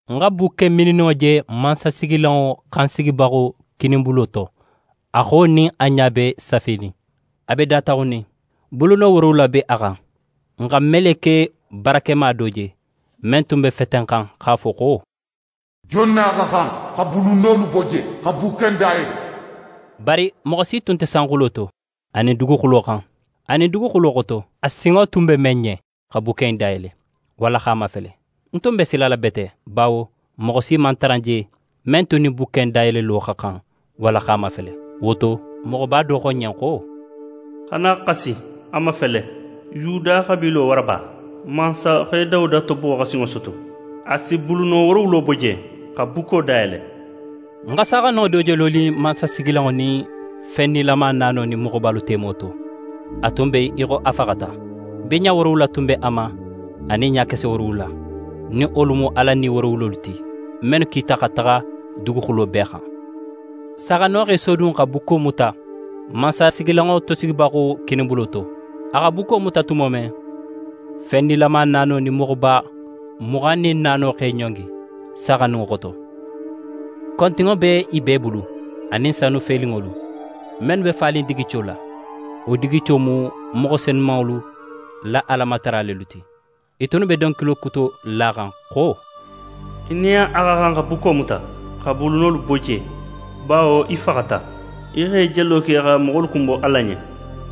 Ń xa bukke mininninŋo je mansasigilanŋo xan sigibaxo kininbulo to, a xo nin a ɲa be safenin. A be dataxunnin. Buluno woorowula be a xan. Ń xa meleke barakema do je, men tun be fetenxan x'a fo xo: «Jon nin a xa xan xa bulunolu bo je, xa bukke in dayele?» Bari moxo si tun nte sanxulo to, anin duguxulo xan, anin duguxulo xoto, a sinŋo tun be men ɲen xa bukke in dayele, walla x'a mafele. Nte tun be xasila bete, bawo moxo si man tara je men tun nin bukke in dayelelo xa xan walla x'a mafele. Wo to, moxoba do xo ń ɲen xo: «Xana xasi. A mafele: Yuda xabiilo waraba, mansaxe Dawuda tobo xa sinŋo soto. A si buluno woorowulo bo je, xa bukko dayele.» Ń xa Saaxandinŋo do je lonin mansasigilanŋo nin fen nilama naano nin moxobalu temo to. A tun be í xo a faxata. Biɲa woorowula tun b'a ma anin ɲakese woorowula, nin wolu mu Ala Ni woorowulo ti, mennu kita xa taxa duguxulo bee xan. Saaxandinŋo x'é sodun xa bukko muta mansasigilanŋo tosigibaxo kininbulo to. A xa bukko muta tumo men, fen nilama naano nin moxoba muxan nin naano x'e ɲongi Saaxandinŋo xoto. Kontinŋo be i bee bulu, anin sanu felinŋolu, mennu be fanin digico la, wo digico mu moxo senumanŋolu la Alamatara lelu ti. I tunnu be donkili kuto laxan xo: «Í nin a xa xan xa bukko muta, x'a bulunolu bo je; bawo í faxata, í x'é jelo ke xa moxolu kunbo Ala ɲen,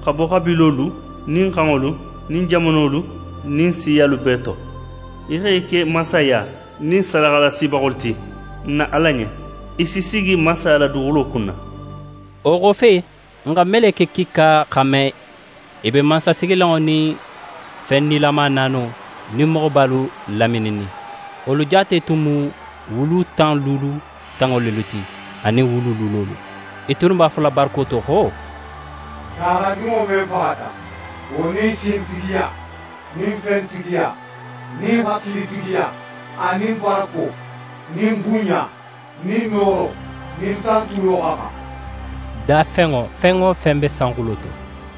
xa bo xabiilolu nin xanŋolu nin jamanolu nin siyalu bee to. Í x'e ke mansaya, nin sadaxalasibaxolu ti, n na Ala ɲen. I si sigi mansaya la duguxulo kunna.» Wo xofe, ń xa meleke kiika xanme i be mansasigilanŋo nin fen nilama naano nin moxobalu lamininnin. Wolu jaate tun mu wulu tan wulu tanŋo lelu ti anin wulu wulolu. I tunnu b'a fola barako to xo: «Saaxandinŋo men faxata, wo nin sintigiya nin fentigiya nin hakilitigiya anin barako nin bunɲa nin nooro nin tantulo xa xan!» Dafenŋo fen wo fen be sanxulo to,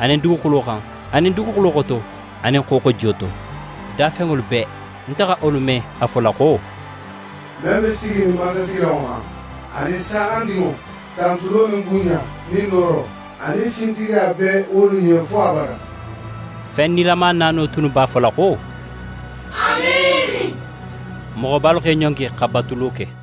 anin duguxulo xan, anin duguxulo xoto, anin xooxojiyo to, dafenŋolu bee, nte xa wolu me a fola xo: «Men be siginin mansasigilanŋo xan anin Saaxandinŋo, tantulo nin bunɲa nin nooro anin sintigiya be wolu ɲen fo abada!» Fen nilama naano tunnu b'a fola xo: Amiini! Moxobalu x'e ɲongi xa batulo ke.